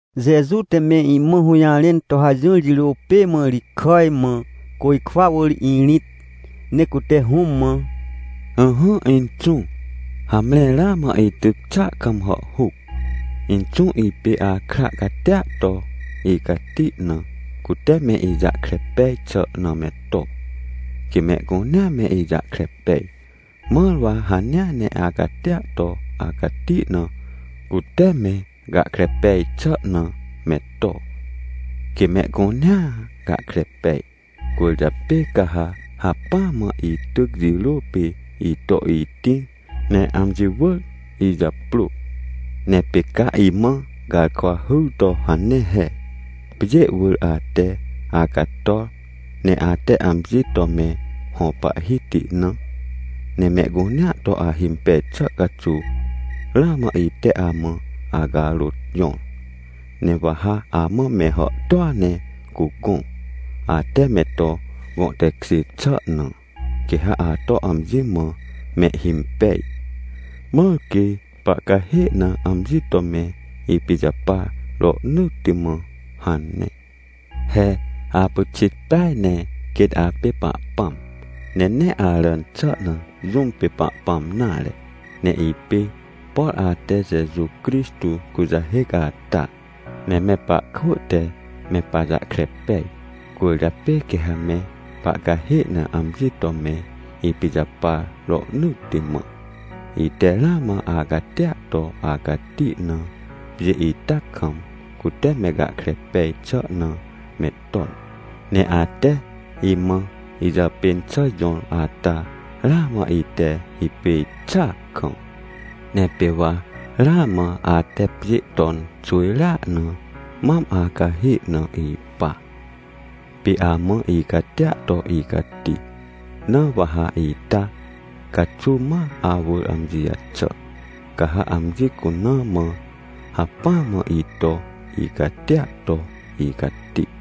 Jeju te me imã hũjarẽn to hajỹr jirô pê mã ri kàj mã, côjkwa wỳr irĩt, ne cute Hũm mã: — Ỹhỹ Inxũ, hamre ramã ityc xàa kam hàhhuc. Inxũ, ipê akra catia to icati na, cute me ijahkre pej xà na me to, quê mehcunea me ijahkre pej, mãr wa hanea ne acatia to acati na, cute me gahkre pej xà na me to, quê mehcunea gahkre pej. Cwỳrjapê ca ha hacpỹa mã ityc jirô pê ito itĩr ne amji wỳr ijaprô. Ne pê ca imã garkwa hyr to hane he: “Pjê wỳr ate acator, ne ate amji to me hõ Pahhiti na, ne mehcunea to ahimpej xà caxuw, ramã ite amã acarôt jõr. Ne wa ha amã me hàhtôa ne cugõ, ate me to gõ tekjê xà na, quê ha ato amji mã mehhimpej, mãr quê pahcahê na amji to me ipijapar rohnỳtti mã” hane. He apyxit peaj ne quêt apê Pahpãm, ne nee aràn xà na jũm pê Pahpãm nare. Ne ipê por ate Jeju Crixtô kujahêc ata. Ne me pahkwỳ te me pajahkre pej, cwỳrjapê quê ha me pahcahê na amji to me ipijapar rohnỳtti mã. Ite ramã acatia to acati na pjê ita kam, cute me gahkre pej xà na me ton. Ne ate imã ijàpên xà jõr ata, ramã ite hipêj xàa kam. Ne pê wa ramã ate pjê ton xwỳjrea na mam acahê na ipa, pê amã icatia to icati. Na wa ha ita caxuw ma awỳr amji jaxà, ca ha amji cuna mã hacpỹa mã ito icatia to icati.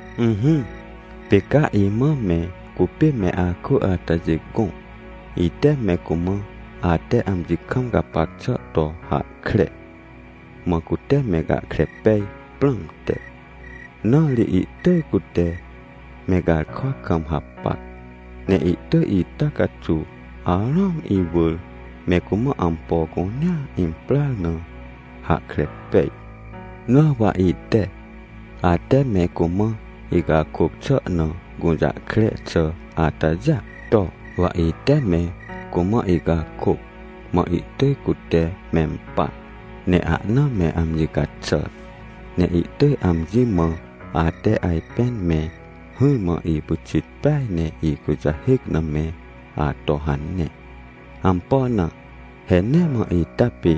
— Ỹhỹ, pê ca imã me cupê me akwỳ atajê gõ, ite me cumã ate amji kam gapac xà to hahkre, mã cute me gahkre pej prãmte. Na ri ihtỳj cute me garkwa kam hapac. Ne ihtỳj ita caxuw arũam iwỳr me cumã ampo cunea imprar na hahkre pej. Na wa ite, ate me cumã icakôc xà na gũjahkre xà atajêa to, wa ite me cumã icakôc, mã ihtỳj cute mempar, ne ahna me amji caxàr. Ne ihtỳj amji mã ate ajpên me hỹrmã ipyxit peaj ne ikujahêc na me ato hane. Ampo na? He nee mã ita pê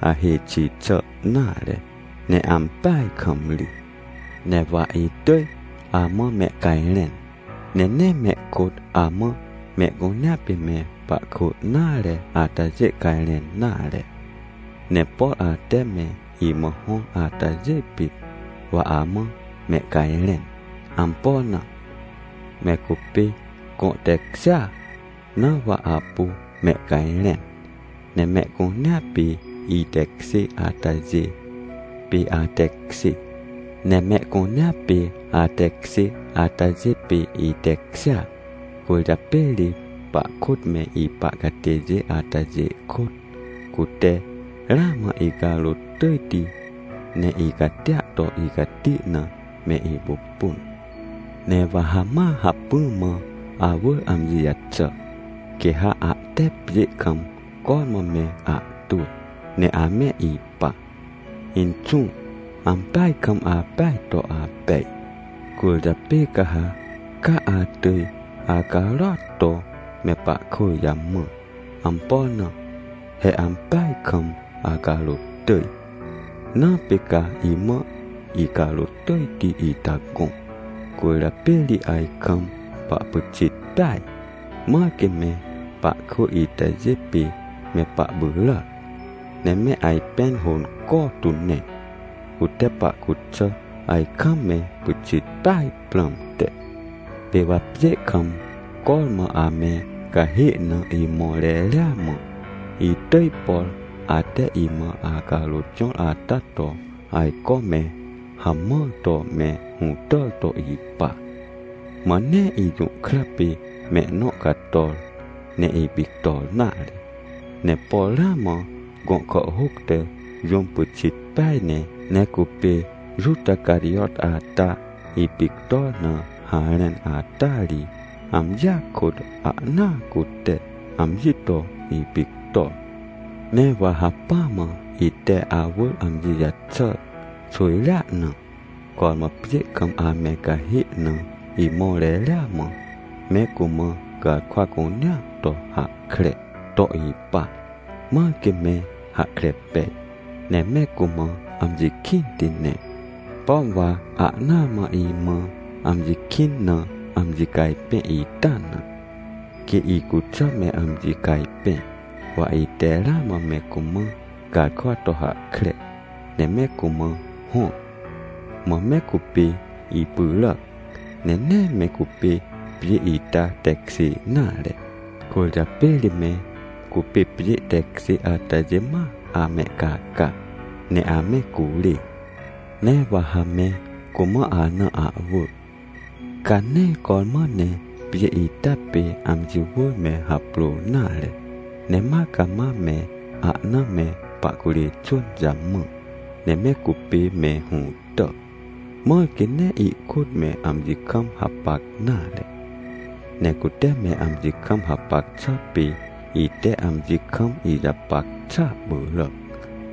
ahêj xi xà nare, ne ampeaj kam ri. — Ne wa itỳj amã mehcajrẽn, ne nee mehkôt amã mehcunea pê me pahkwỳ nare atajê cajrẽn nare, ne por ate me imã hõr atajê pit, wa amã mehcajrẽn. Ampo na? Me cupê gõ tekjêa, na wa apu mehcajrẽn. Ne mehcunea pê itekjê atajê pê atekjê, ne mehcunea pê atekjê atajê pê itekjêa. Cwỳrjapê ri pahkôt me ipa catêjê atajê kôt, cute ramã icarôt tỳjti, ne icatia to icati na me ipupun. Ne wa ha ma hacpỹ mã awỳr amji jaxà, quê ha ahte pjê kam cormã me ahtwỳ ne ame ipa. Inxũ, ampeaj kam apeaj to apej. Cwỳrjapê ca ha ca atỳj acarôat to me pahkwỳ jamã. Ampo na? He ampeaj kam acarôt tỳj, na pê ca imã icarôt tỳjti ita gõ. Cwỳrjapê ri ajkam pahpyxit peaj. Mãr quê me pahkwỳ itajê pê me pahpyràac, ne me ajpẽn hônco tu ne, cute pahcuxà ajkam me pyxit peaj prãmte. Pê wa pjê kam cormã ame cahê na imõr reria mã, itỳj, por ate imã acarôt jõr ata to ajco me hamãr to me hũtàr to ipa. Mã nee ijũhkra pê mehnõ cator, ne ipictor nare. Ne por ramã gõ kàhhôc te jũm pyxit peaj ne, ne cupê Juta Carijot ata ipictor na harẽn ata ri, amjia kôt ahnaa cute amji to ipictor. — Ne wa hacpỹ mã ite awỳr amji jaxàr xwỳjrea na, cormã pjê kam ame cahê na imõr reria mã me cumã garkwa cunea to hahkre to ipa, mãr quê me hahkre pej, ne me cumã amji kĩnti ne. Pom wa ahnaa mã imã amji kĩn na amji cajpẽ ita na, quê icuxà me amji cajpẽ. Wa ite ramã me cumã garkwa to hahkre, ne me cumã hõr. Mã me cupê ipyràac, ne nee me cupê pjê ita tekjê nare, cwỳrjapê ri me cupê pjê tekjê atajê ma amehcaca, ne ame curê. Ne wa ha me cumã ana ahwỳ, ca nee cormã ne pjê ita pê amji wỳr me haprôr nare, ne ma cama me ahna me pahcurê xwỳn jamã, ne me cupê me hũtà, mãr quê nee ihkôt me amji kam hapac nare. Ne cute me amji kam hapac xà pê ite amji kam ijapac xàa pyràc,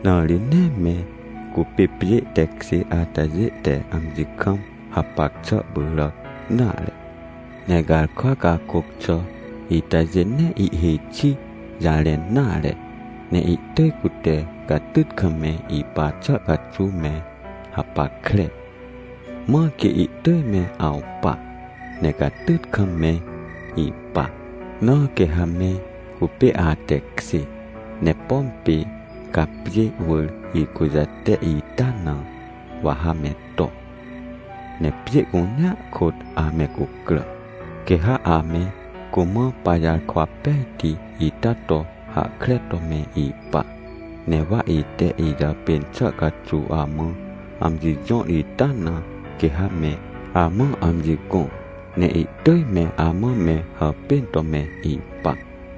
na ri nee me cupê pjê tekjê atajê te amji kam hapac xà pyràc nare. Ne garkwa cakôc xà itajê nee ihhêj xi jarẽn nare, ne ihtỳj cute catyt kam me ipa xà caxuw me hapackre, mãr quê ihtỳj me awpa, ne catyt kam me ipa. Na quê ha me cupê atekjê. Ne pom pê ca pjê wỳr ikujate ita na, wa ha me to, ne pjê cunea kôt ame cucrà, quê ha ame cumã pajarkwa pejti ita to hahkre to me ipa. Ne wa ite ijàpên xà caxuw amã amji jõr ita na quê ha me amã amji gõ, ne ihtỳj me amã me hàpên to me ipa.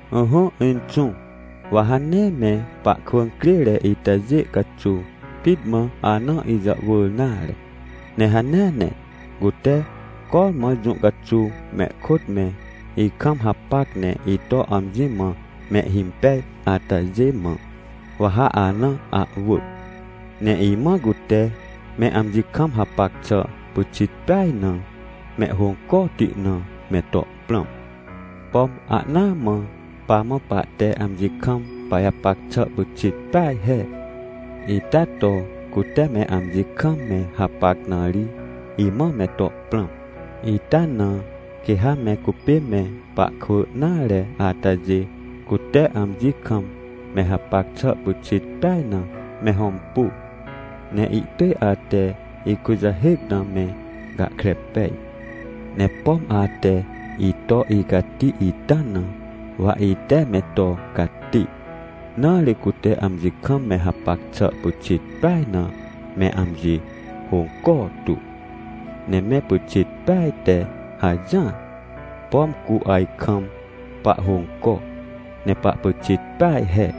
— Ỹhỹ Inxũ, wa ha nee me pahkwỳ crêre itajê caxuw pit mã ana ijàhwỳr nare. Ne hanea ne cute cormã jũ caxuw mehkôt me ikam hapac ne ito amji mã mehhimpej atajê mã, wa ha ana ahwỳ. Ne imã cute me amji kam hapac xà pyxit peaj na mehhôncoti na me to prãm. Pom ahnaa mã pamã pahte amji kam pajapac xà pyxit peaj he, ita to cute me amji kam me hapac na ri, imã me to prãm. Ita na quê ha me cupê me pahkwỳ nare atajê cute amji kam me hapac xà pyxit peaj na me hõmpu, ne ihtỳj ate ikujahêc na me gahkre pej. Ne pom ate ito icati ita na, wa ite me to cati, na ri cute amji kam me hapac xà pyxit peaj na me amji hônco tu, ne me pyxit peaj te hajỹar, pom cu ajkam pahhônco, ne pahpyxit peaj he.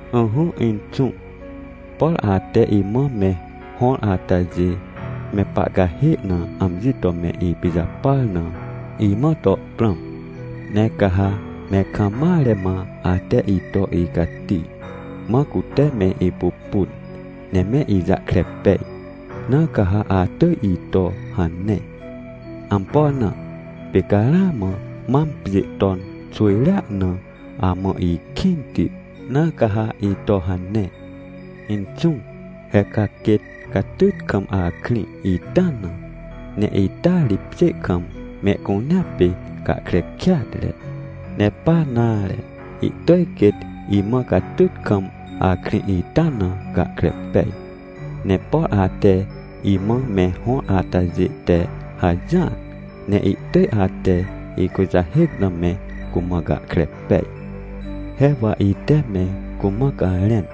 — Ỹhỹ Inxũ, por ate imã me hõr atajê me pahcahê na amji to me ipijapar na, imã to prãm. Ne ca ha me kam mare mã ate ito icati, mã cute me ipupun, ne me ijahkre pej. Na ca ha atỳj ito hane. Ampo na? Pê ca ramã mam pjê ton xwỳjrea na amã ikĩnti, na ca ha ito hane. — Inxũ, he ca quêt catyt kam akrĩ ita na, ne ita ri pjê kam mehcunea pê gahkre kêatre. Ne pa nare, ihtỳj quêt imã catyt kam akrĩ ita na gahkre pej. Ne por ate imã me hõr atajê te hajỹar ne ihtỳj ate ikujahêc na me cumã gahkre pej. He wa ite me cumã garẽn,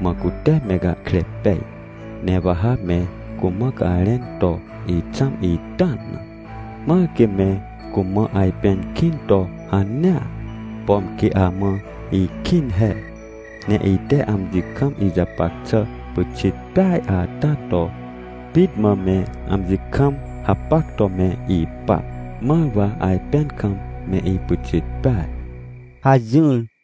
mã cute me gahkre pej. Ne wa ha me cumã garẽn to ixãm ita na, mãr quê me cumã ajpẽn kĩn to hanea, pom quê amã ikĩn he. Ne ite amji kam ijapac xà pyxit peaj ata to pit mã me amji kam hapac to me ipa, mãr wa ajpẽn kam me ipyxit peaj — hajỹr.